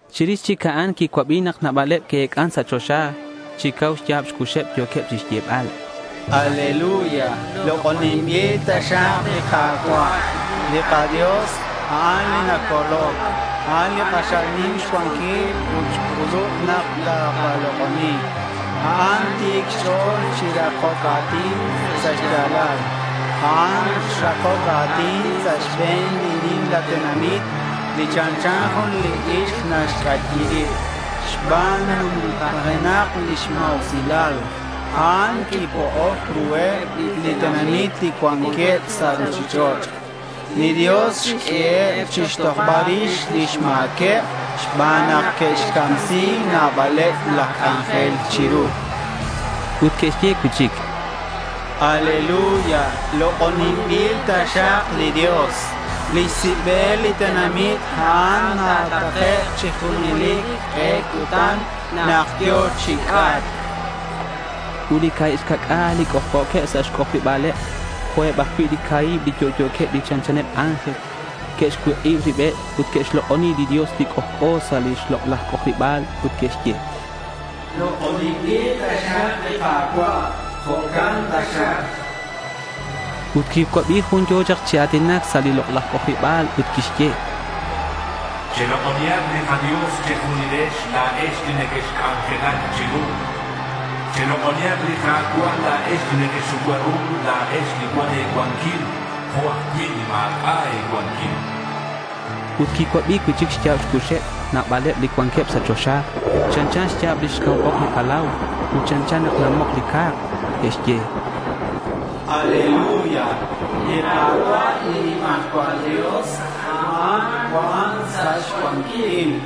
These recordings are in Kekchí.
Chirix chic a'an quicuabi nak nabaleb que'ec'an sa' choxa. Chi cau xya̱b xcuxeb yo̱queb chixyebal: —Aleluya. Lok'oninbil taxak li Ka̱cua'. Li kaDios, a'an li nacoloc. A'an li k'axal nim xcuanquil ut xc'ulub nak ta̱lok'oni̱k. A'an ti̱c xch'o̱l chi rakoc a̱tin sa' xya̱lal. A'an xrakoc a̱tin sa' xbe̱n li nimla tenamit li chanchan jun li ixk naxc'ayi rib. Xban nak numtajenak lix ma̱usilal, a'an quipo'oc ruheb li tenamit li cuanqueb sa' ruchich'och'. Li Dios xq'ueheb chixtojbal rix lix ma̱queb xban nak que'xcamsi nabaleb laj c'anjel chiru.— Ut que'xye cui'chic: —Aleluya, lok'oninbil taxak li Dios. Lix sibel li tenamit a'an ta̱takek' chi junelic k'e cutan nak yo̱k chi c'atc.— Ut li ca̱hib xca'c'a̱l li c'ojc'o̱queb sa' xc'ojariba̱leb jo'queb ajcui' li ca̱hib li yo'yo̱queb li chanchaneb ángel que'xcuik'ib ribeb ut que'xlok'oni li Dios li c'ojc'o sa' li lok'laj c'ojariba̱l ut que'xye: —Lok'oninbil taxak li Ka̱cua'. Jo'can taxak, chanqueb. Ut quicuabi jun yo̱ chak chi a̱tinac sa' li lok'laj c'ojariba̱l ut quixye: —Chelok'onihak li kaDios che̱junilex la̱ex li nequexc'anjelac chiru. Chelok'onihak li Ka̱cua' la̱ex li nequexucua ru, la̱ex li cuan e̱cuanquil jo' ajcui' li ma̱c'a' e̱cuanquil.— Ut quicuabi cui'chic xya̱b xcuxeb nabaleb li cuanqueb sa' choxa. Chanchan xya̱b lix cau ok li palau ut chanchan nak namok li ca̱k. Que'xye: —Aleluya. Li Ka̱cua' li nimajcual Dios, a'an cuan sa' xcuanquil.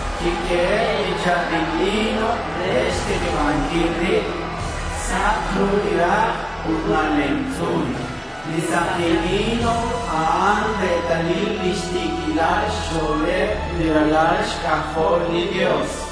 Quiq'uehe' li cha̱bil lino re xtikibanquil rib. Sak ru li rak' ut nalemtz'un. Li saki lino a'an retalil lix ti̱quilal xch'o̱leb li ralal xc'ajol li Dios.—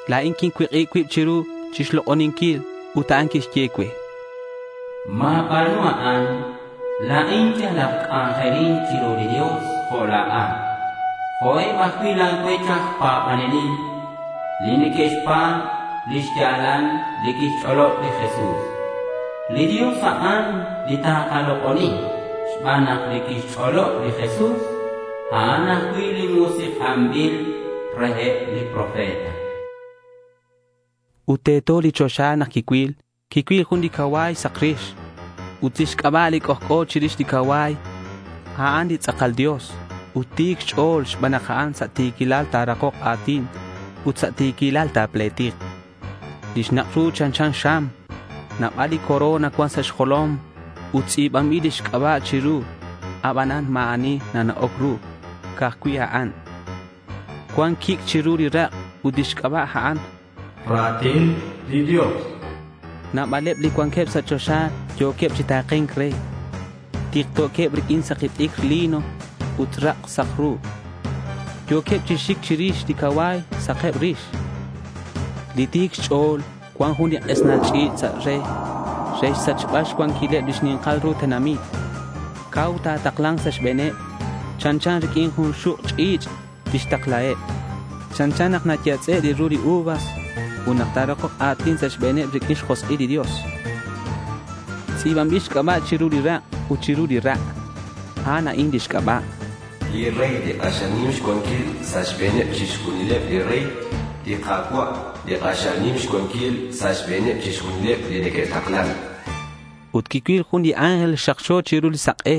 La̱in quincuik'ib cuib chiru chixlok'oninquil. Ut a'an quixye cue: —Ma̱ba̱nu a'an. La̱in yal aj c'anjelin chiru li Dios jo' la̱at, ut jo' eb ajcui' la̱ cuech aj pa̱banelil, li neque'xpa̱b li xya̱lal li quixch'olob li Jesús. Li Dios, a'an li ta̱lok'oni, chan cue, xban nak li quixch'olob li Jesús, a'an ajcui' li musik'anbil reheb li profeta. Ut teto li choxa nak quicuil. Quicuil jun li cacua̱y sak rix. Ut lix c'aba' li c'ojc'o chirix li cacua̱y, a'an “Tz'akal Dios” ut “Ti̱c Xch'o̱l”, xban nak a'an sa' ti̱quilal ta̱rakok a̱tin ut sa' ti̱quilal ta̱pletik. Lix nak' ru chanchan xam. Nabal li corona cuan sa' xjolom ut tz'i̱banbil lix c'aba' chiru. Abanan ma̱ ani nata'oc ru. Ca'aj cui' a'an. Cuan quic' chiru li rak' ut lix c'aba' a'an “Ra̱tin li Dios”. Nabaleb li cuanqueb sa' choxa yo̱queb chi ta̱ke̱nc re. Tikto̱queb riq'uin li saki t'icr lino ut sak ru. Yo̱queb chi xic chirix li cacua̱y sakeb rix. Li Ti̱c Xch'o̱l cuan jun li k'esnal ch'i̱ch' sa' re, re xsachbal xcuanquileb li xni̱nkal ru tenamit. Cau ta̱takla̱nk sa' xbe̱neb. Chanchan riq'uin jun xuk' ch'i̱ch' tixtaklaheb. Chanchan nak nayatz'e' li ru li uvas nak ta̱rakok a̱tin sa' xbe̱neb riq'uin xjosk'il li Dios. Tz'i̱banbil xc'aba' chiru li rak' ut chiru li ra'. A'an a'in lix c'aba': Li Rey li k'axal nim xcuanquil sa' xbe̱neb chixjunileb li rey. Li Ka̱cua', li k'axal nim xcuanquil sa' xbe̱neb chixjunileb li neque'taklan. Ut quicuil jun li ángel xakxo chiru li sak'e.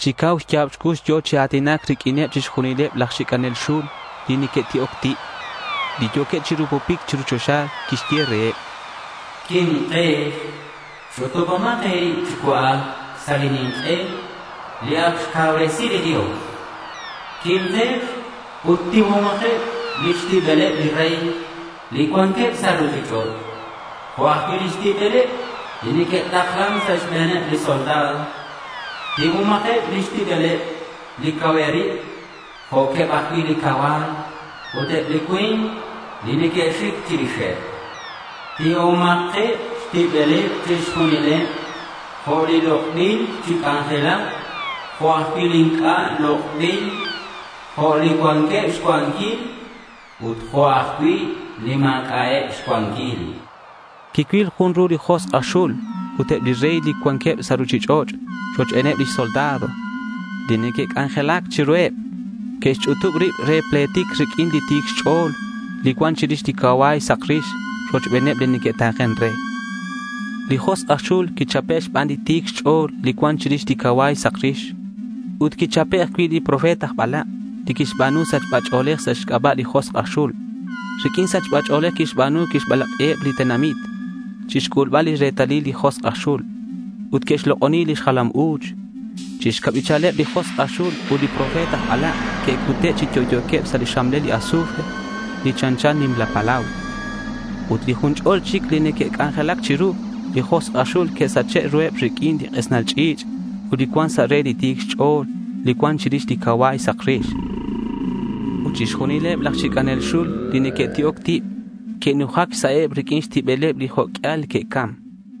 Chi cau xya̱b xcux yo̱ chi a̱tinac riq'uineb chixjunileb laj xic'anel xul li neque'ti'oc tib, li yo̱queb chi rupupic chiru choxa. Quixye reheb: —Quimkex. Ch'utubomak e̱rib chi cua'ac sa' li nink'e li ac xcauresi li Dios. Quimkex ut tiuhomakeb lix tibeleb li rey li cuanqueb sa' ruchich'och' jo' ajcui' lix tibeleb li neque'taklan sa' xbe̱neb li soldado. Tiuhomakeb xtibeleb li cauheb rib jo'queb ajcui' li cacua̱y ut eb li cui̱nk li neque'xic chirixeb. Tiuhomakeb xtibeleb chixjunileb, jo' li lok'bil chi c'anjelac jo' ajcui' li inc'a' lok'bil, jo' li cuanqueb xcuanquil ut jo' ajcui' li ma̱c'a'eb xcuanquil.— Quicuil ru li josk' aj xul ut eb li rey li cuanqueb sa' ruchich'och' rochbeneb li soldado li neque'c'anjelac chiruheb. Que'xch'utub rib re te'pletik riq'uin li Ti̱c Xch'o̱l li cuan chirix li cacua̱y sak rix rochbeneb li neque'ta̱ken re. Li josk' aj xul quichape' xban li Ti̱c Xch'o̱l li cuan chirix li cacua̱y sak rix ut quichape' ajcui' li profeta aj balak', li quixba̱nu li sachba ch'o̱lej sa' xc'aba' li josk' aj xul. Riq'uin li sachba ch'o̱lej quixba̱nu quixbalak'i nabaleb li tenamit chixc'ulbal li retalil li josk' aj xul ut que'xlok'oni lix jalam u̱ch. Chi xcabichaleb li josk' aj xul ut li profeta aj balak' que'cute' chi yo'yo̱queb sa' li xxamlel li azufre li chanchan nimla palau. Ut li jun ch'ol chic li neque'c'anjelac chiru li josk' aj xul que'sache' ruheb riq'uin li k'esnal ch'i̱ch' li cuan sa' re li Ti̱c Xch'o̱l li cuan chirix li cacua̱y sak rix. Ut chixjunileb laj xic'anel xul li neque'ti'oc tib que'nujac xsa'eb riq'uin xtibeleb li jo' q'uial que'cam.